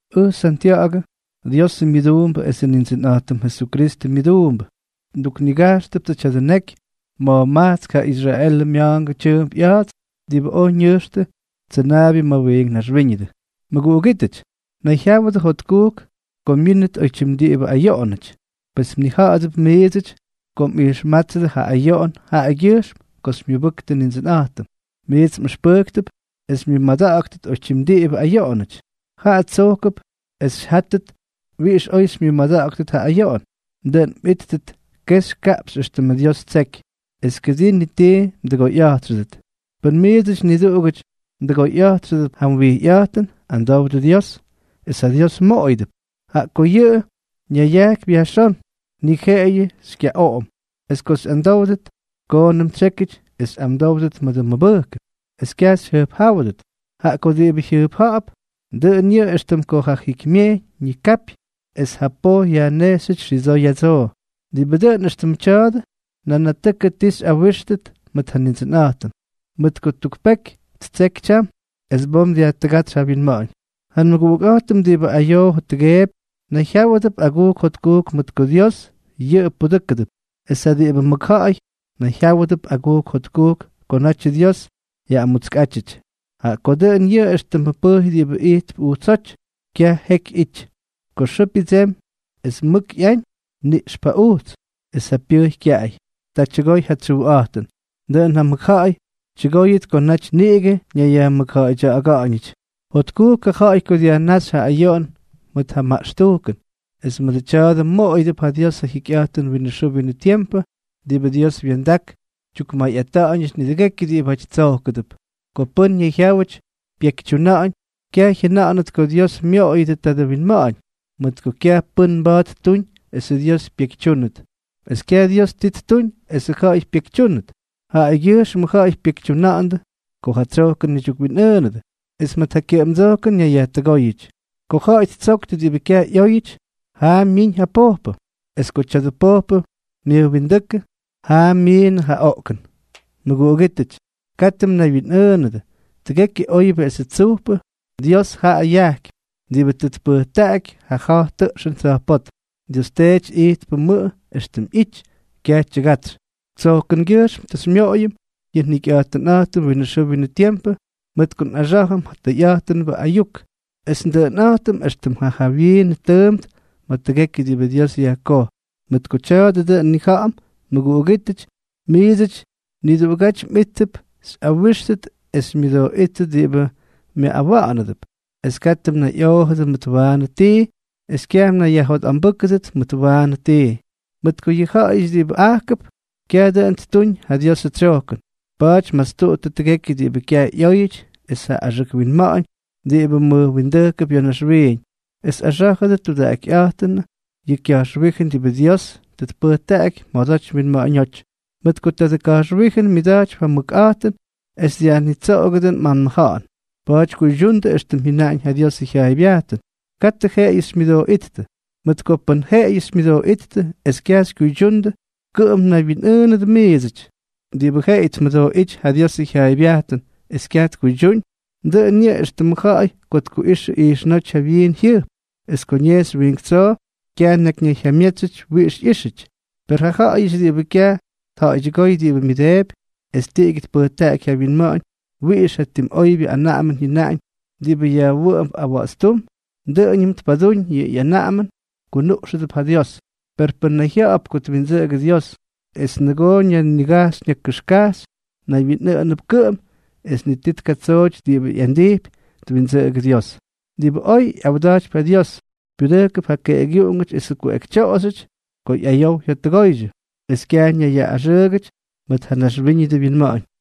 Ʉj Santya̱ꞌa̱gʉ, Diosʉ myʉduumbʉ esʉ Nindsʉnꞌa̱jtʉm Jesukristʉ myʉduumbʉ. Nduknigajxtʉptsʉ tya̱dʉ neky ma̱jmajtsk ja Israelʉ mya̱a̱ngʉ tyʉʉmp ꞌya̱a̱ts diꞌibʉ oj ñʉjxtʉ tsʉnaabyʉ ma̱ wiink naxwíñʉdʉ. Mʉguꞌugítʉty, nayjyáwʉdʉ jotkujk ko myínʉt oytyim diꞌibʉ ayoꞌonʉty. Pes mnija̱ꞌa̱dʉp miidsʉty ko mꞌijxmátsʉdʉ yʉ ayoꞌon jaꞌagyʉjxm ko xymyʉbʉktʉ Nindsʉnꞌa̱jtʉm, miits mꞌʉxpʉ́ktʉp es xymyʉmada̱ꞌa̱ktʉt oytyim diꞌibʉ ayoꞌonʉty. Jaꞌa tsojkʉp es xyjáttʉt wiꞌix oy xymyʉmada̱ꞌa̱ktʉt ja ayoꞌon, dʉꞌʉn mꞌíttʉt kexy kaꞌpxy éxtʉmʉ Dios ttseky, es kʉdii ni tii mdʉgoyꞌa̱jtxʉdʉt. Pʉn miidsʉty niduꞌugʉty mdʉgoyꞌa̱jtxʉp ja wijyꞌa̱jtʉn, amdowdʉ Dios, es ja Dios mmoꞌoyʉdʉp; jaꞌa ko yʉꞌʉ ñayajkypy yajxón, ni jeꞌeyʉ xykyaꞌoꞌom. Es ko xyꞌamdówdʉt, koonʉm tsyékyʉty es xyꞌamdówdʉt mʉdʉ mʉbʉjkʉn, es kyaj xyjʉjpjáwʉdʉt; jaꞌa ko diꞌibʉ jyʉjpja̱ꞌa̱p, dʉꞌʉn yʉꞌʉ éxtʉm ko ja jikymyejyñ ñikapy es ja poj yajnejxyʉty xidsoo ya̱dsoo. Diꞌibʉ dʉꞌʉn éxtʉmʉ tya̱a̱dʉ, nanatʉkʉ ti tꞌawíxʉt mʉt ja Nindsʉnꞌa̱jtʉm, mʉt ko tuk peky ttseky tyam, es bom dyajtʉgátsy ja wyinma̱ꞌa̱ñ. Ja nmʉguꞌukꞌa̱jtʉm diꞌibʉ ayoo jottʉgeepy, nayjyáwʉdʉp agujk jotkujk mʉt ko Dios yʉꞌʉ pudʉ́kʉdʉp. Es ja diꞌibʉ mʉkja̱ꞌa̱y, nayjyáwʉdʉp agujk jotkujk ko natyʉ Dios ꞌyamútskyʉty. Jaꞌa ko dʉꞌʉn yʉꞌʉ éxtʉmʉ pʉjy diꞌibʉ ijtp ujtsóty, kyaj jeky ꞌyity. Ko xʉʉ pyʉdsemy es mʉk ꞌyañ, niꞌxp ja ujts, es ja pyʉjy kyaꞌay, ta tyʉgoy ja tsyujꞌa̱jtʉn. Dʉꞌʉn ja mʉkja̱ꞌa̱y tyʉgóyʉt ko naty niꞌigʉ ñayyajmʉkja̱ꞌa̱ydya̱ꞌa̱ga̱ꞌa̱ñʉty. Jotkujk ja ja̱ꞌa̱y ko dyajnáxy ja ayoꞌon mʉt ja maꞌxtujkʉn, es mʉdʉ tya̱a̱dʉ moꞌoyʉdʉp ja Dios ja jikyꞌa̱jtʉn winʉ xʉʉ winʉ tiempʉ diꞌibʉ Dios wya̱ndak tyukmayꞌata̱ꞌa̱ñʉty nidʉgekyʉ diꞌibáty tsojkʉdʉp. Ko pʉ́n ñayjyáwʉty pyekytyuna̱ꞌa̱ñ, kyaj jyʉna̱ꞌa̱nʉt ko Dios myoꞌoyʉdyʉ tadʉ winma̱ꞌa̱ñ, mʉt ko kyaj pʉ́n mba̱a̱t ttuñ esʉ Dios pyekytyúnʉt, es kyaj Dios ti ttuñ es ja ja̱ꞌa̱y pyekytyúnʉt. Jaꞌagyʉjxmʉ ja̱ꞌa̱y pyekytyuna̱ꞌa̱ndʉ ko ja ꞌyadsojkʉn ñaydyukwinꞌʉʉnʉdʉ, es mʉt ja kyʉꞌʉmdsojkʉn ñayyajtʉgóyʉty. Ko ja̱ꞌa̱y ttsoktʉ diꞌibʉ kyaj ꞌyóyʉty, jaa myiñ ja pojpʉ; es ko tya̱dʉ pojpʉ myʉjwindáknʉ, jaa myiinnʉ ja oꞌkʉn. Mʉguꞌugítʉty, katʉ mnaywyinꞌʉʉnʉdʉ. Tʉgekyʉ oybyʉ esʉ tsujpʉ, Dios jaꞌa yajkypy, diꞌibʉ tʉ tpʉjtaꞌaky ja ja̱j tʉꞌxʉn tsa̱jpótm. Dios Teety ijtpʉmʉꞌʉ éxtʉm ꞌyity, kyaj tyʉgatsy. Tsyojkʉngyʉjxm tʉ xymyoꞌoyʉm yʉ njikyꞌa̱jtʉnꞌa̱jtʉm winʉ xʉʉ winʉ tiempʉ mʉt ko nꞌaxá̱jʉm ja tʉyꞌa̱jtʉnbʉ ayuk, es ndʉꞌʉnꞌa̱jtʉm éxtʉm ja jawyiin tʉʉmp ma̱ tʉgekyʉ diꞌibʉ Dios yajkoj. Mʉt ko tya̱a̱dʉ dʉꞌʉn nnija̱ꞌa̱m, mʉguꞌugítʉty, miidsʉty niduꞌugáty mꞌíttʉp xyꞌawíxtʉt es xymyʉdooꞌíttʉt diꞌibʉ myaꞌꞌawa̱ꞌa̱nʉdʉp. Es katʉ mnayꞌoojʉdʉ mʉt waanʉ tii, es kyaj mnayyajjotꞌambʉ́kʉdʉt mʉt waanʉ tii. Mʉt ko yʉ ja̱ꞌa̱yʉty diꞌibʉ ajkʉp, kyaj dʉꞌʉn ttuñ ja Diosʉ tsyojkʉn. Pa̱a̱ty mastuꞌuttʉ tʉgekyʉ diꞌibʉ kyaj ꞌyóyʉty es ja axʉk winma̱ꞌa̱ñ diꞌibʉ mʉjwindʉjkʉp ya̱ naxwiiñ, es axá̱jʉdʉ tudaꞌakytyiꞌknʉ yʉ ka̱jxwíjʉn diꞌibʉ Dios tʉ tpʉjtaꞌaky mjodoty mwinma̱ꞌa̱ñóty. Mʉt ko tadʉ ka̱jxwíjʉn myʉda̱jtypy ja mʉkꞌa̱jtʉn es dyajnitsoꞌogʉdʉ mꞌanmʉja̱ꞌa̱n. Pa̱a̱ty kuydyundʉ éxtʉm jyʉnaꞌañ ja Diosʉ jyaaybyajtʉn; katʉ jeꞌeyʉ xymyʉdooꞌíttʉ. Mʉt ko pʉn jeꞌeyʉ xymyʉdooꞌíttʉ es kyaj xykyuydyundʉ, kʉꞌʉm mnaywyinꞌʉʉnʉdʉ miidsʉty. Diꞌibʉ jeꞌeyʉ tmʉdooꞌíty ja Diosʉ jyaaybyajtʉn es kyaj tkuydyúñ, dʉꞌʉn yʉꞌʉ éxtʉmʉ ja̱ꞌa̱y ko tkuꞌixʉ ijxnóty ja wyiin jyʉjp, es ko ñejxy wiink tsoo, kyaj tnakyjyamyetsy wiꞌix ꞌyíxyʉty. Per ja ja̱ꞌa̱yʉty diꞌibʉ kyaj tja̱ꞌa̱ydyʉgóy diꞌibʉ myʉdeepy, es tiꞌigyʉ tpʉjtaꞌaky ja wyinma̱ꞌa̱ñ wiꞌix ja tim oybyʉ anaꞌamʉn jyʉnaꞌañ diꞌibʉ yajwʉꞌʉmp awa̱ꞌa̱tstúm, es dʉꞌʉñʉm tpadúñ yʉ anaꞌamʉn, kunuꞌxʉdʉp ja Dios. Per pʉ́n nayjya̱ꞌa̱p ko twindsʉꞌʉgʉ Dios, es nʉgoo ñanigajxy ñakʉxkajxy, naywyinꞌʉꞌʉnʉp kʉꞌʉm es ni ti tkatsooty diꞌibʉ ꞌyandijpy twindsʉꞌʉgʉ Dios. Diꞌibʉ oy ꞌyawda̱jtypy ja Dios, pyudʉjkʉp ja keꞌꞌegyuꞌungʉty esʉ kuꞌekytyoꞌoxyʉty ko ꞌyayow jyottʉgooydyʉ, es kyaj ñayyaꞌꞌaxʉʉgʉty mʉt ja naxwíñʉdʉ winma̱ꞌa̱ñ.